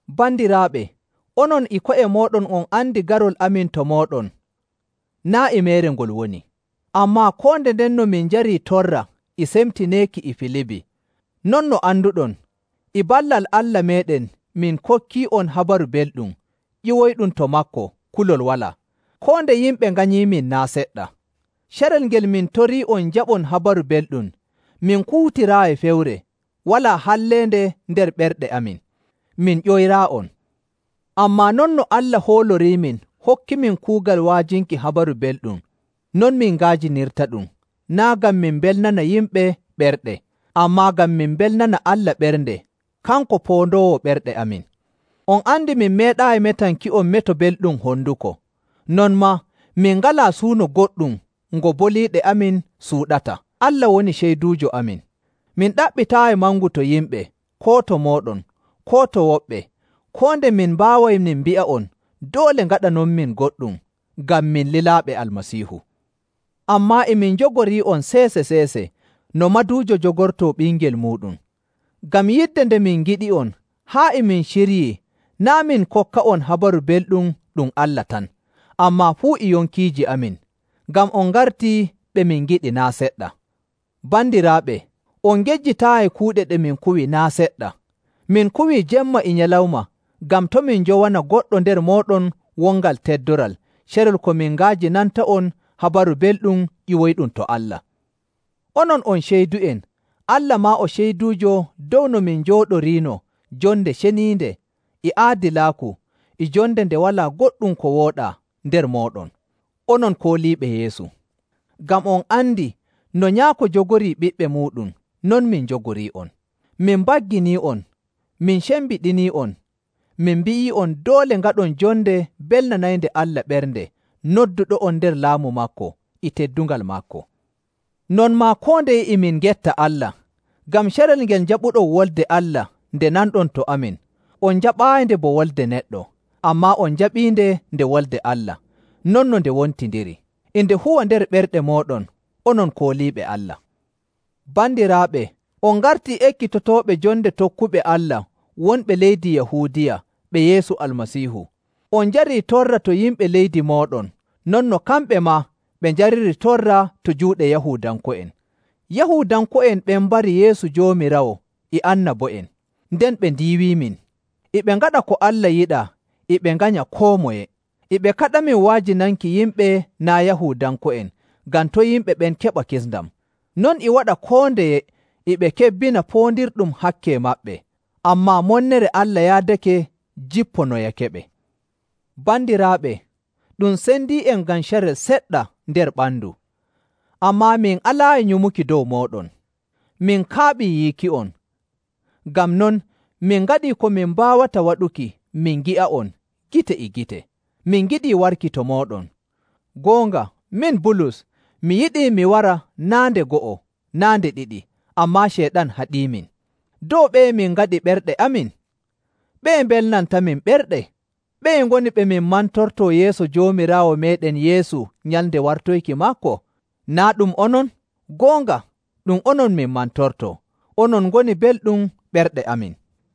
Bandiraaɓe, onon e ko'e mooɗon on andi garol amin to mooɗon naa' e meere ngol woni. Ammaa koo nde ndenno min njarii torra e semtineeki e Filibi, non no anduɗon, e ballal Allah meeɗen min kokkii'on Habaru Belɗum ƴiwoyɗum to maako kulol walaa, koo nde yimɓe nganyiimin naa' seɗɗa. Carel ngel min torii'on njaɓon Habaru Belɗum, min kuutiraayi fewre, walaa halleende nder ɓerɗe amin, min ƴoyraayi'on. Ammaa non no Allah hooloriimin hokkimin kuugal wa'ajinki Habaru Belɗum, non min nga'ajinirtaɗum, naa' ngam min mbelnana yimɓe ɓerɗe, ammaa ngam min mbelnana Allah ɓernde kanko poondoowo ɓerɗe amin. On andi min meeɗaayi metanki'on meto belɗum honduko, non maa min ngalaa suuno goɗɗum ngo boliiɗe amin suuɗata, Allah woni ceyduujo amin. Min ɗaɓɓitaayi mangu to yimɓe, koo to mooɗon, koo to woɓɓe, koo nde min mbaaway min mbi'a'on doole ngaɗanonmin goɗɗum ngam min lilaaɓe Almasiihu. Ammaa e min jogorii'on seese‑seese no maduujo jogortoo ɓingel muuɗum. Ngam yidde nde min ngiɗi'on haa e min ciryii naa' min kokka'on Habaru Belɗum ɗum Allah tan, ammaa fuu e yonkiiji amin, ngam on ngartii ɓe min ngiɗi naa' seɗɗa. Bandiraaɓe, on ngejjitaayi kuuɗe ɗe min kuwi naa' seɗɗa. Min kuwii jemma e nyalawma ngam to' min njowana goɗɗo nder mooɗon wongal teddoral carel ko min nga'ajinanta'on Habaru Belɗum ƴiwoyɗum to Allah. Onon on ceydu'en, Allah maa o ceyduujo dow no min njooɗorinoo jonde ceniinde e aadilaaku e jonde nde walaa goɗɗum ko wooɗaa nder mooɗon, onon kooliiɓe Yeesu. Ngam on andi no nyaako jogorii ɓiɓɓe muuɗum, non min jogorii'on. Min mbagginii'on, min cembiɗinii'on, min mbi'ii'on doole ngaɗon jonde belnanaynde Allah ɓernde nodduɗo'on nder Laamu maako e teddungal maako. Non maa koo ndeye e min ngetta Allah, ngam carel ngel njaɓuɗon Wolde Allah nde nanɗon to amin, on njaɓaayinde bo wolde neɗɗo, ammaa on njaɓiinde nde Wolde Allah, non no nde wontindiri. E nde huwa nder ɓerɗe mooɗon, onon kooliiɓe Allah. Bandiraaɓe, on ngartii ekkitotooɓe jonde tokkuɓe Allah wonɓe leydi Yahuudiya ɓe Yeesu Almasiihu. On njarii torra to yimɓe leydi mooɗon non no kamɓe maa ɓe njariri torra to juuɗe Yahuudanko'en. Yahuudanko'en ɓen mbari Yeesu Joomiraawo e annabo'en, nden ɓe ndiiwimin. E ɓe ngaɗa ko Allah yiɗaa, e ɓe nganya koo moye! E ɓe kaɗamin wa'ajinanki yimɓe naa' Yahuudanko'en ngam to' yimɓe ɓen keɓa kisndam. Non e waɗa koo ndeye e ɓe kebbina poondirɗum hakke maɓɓe. Ammaa monnere Allah yaadake jipponoyakeɓe. Bandiraaɓe, ɗum sendii'en ngam carel seɗɗa nder ɓandu, ammaa min alaayi nyumuki dow mooɗon. Min kaaɓii yiiki'on; ngam non min ngaɗii ko min mbaawata waɗuki min ngi'a'on gite e gite. Min ngiɗii warki to mooɗon. Goonga, min Bulus, mi yiɗii mi wara naa' nde go'o naa' nde ɗiɗi, ammaa Ceyɗan haɗiimin. Dow ɓeye min ngaɗi ɓerɗe amin? Ɓeye mbelnantamin ɓerɗe? Ɓeye ngoni ɓe min mantortoo yeeso Joomiraawo meeɗen Yeesu nyalnde wartoyki maako? Naa' ɗum onon? Goonga, ɗum onon min mantortoo. Onon ngoni belɗum ɓerɗe amin.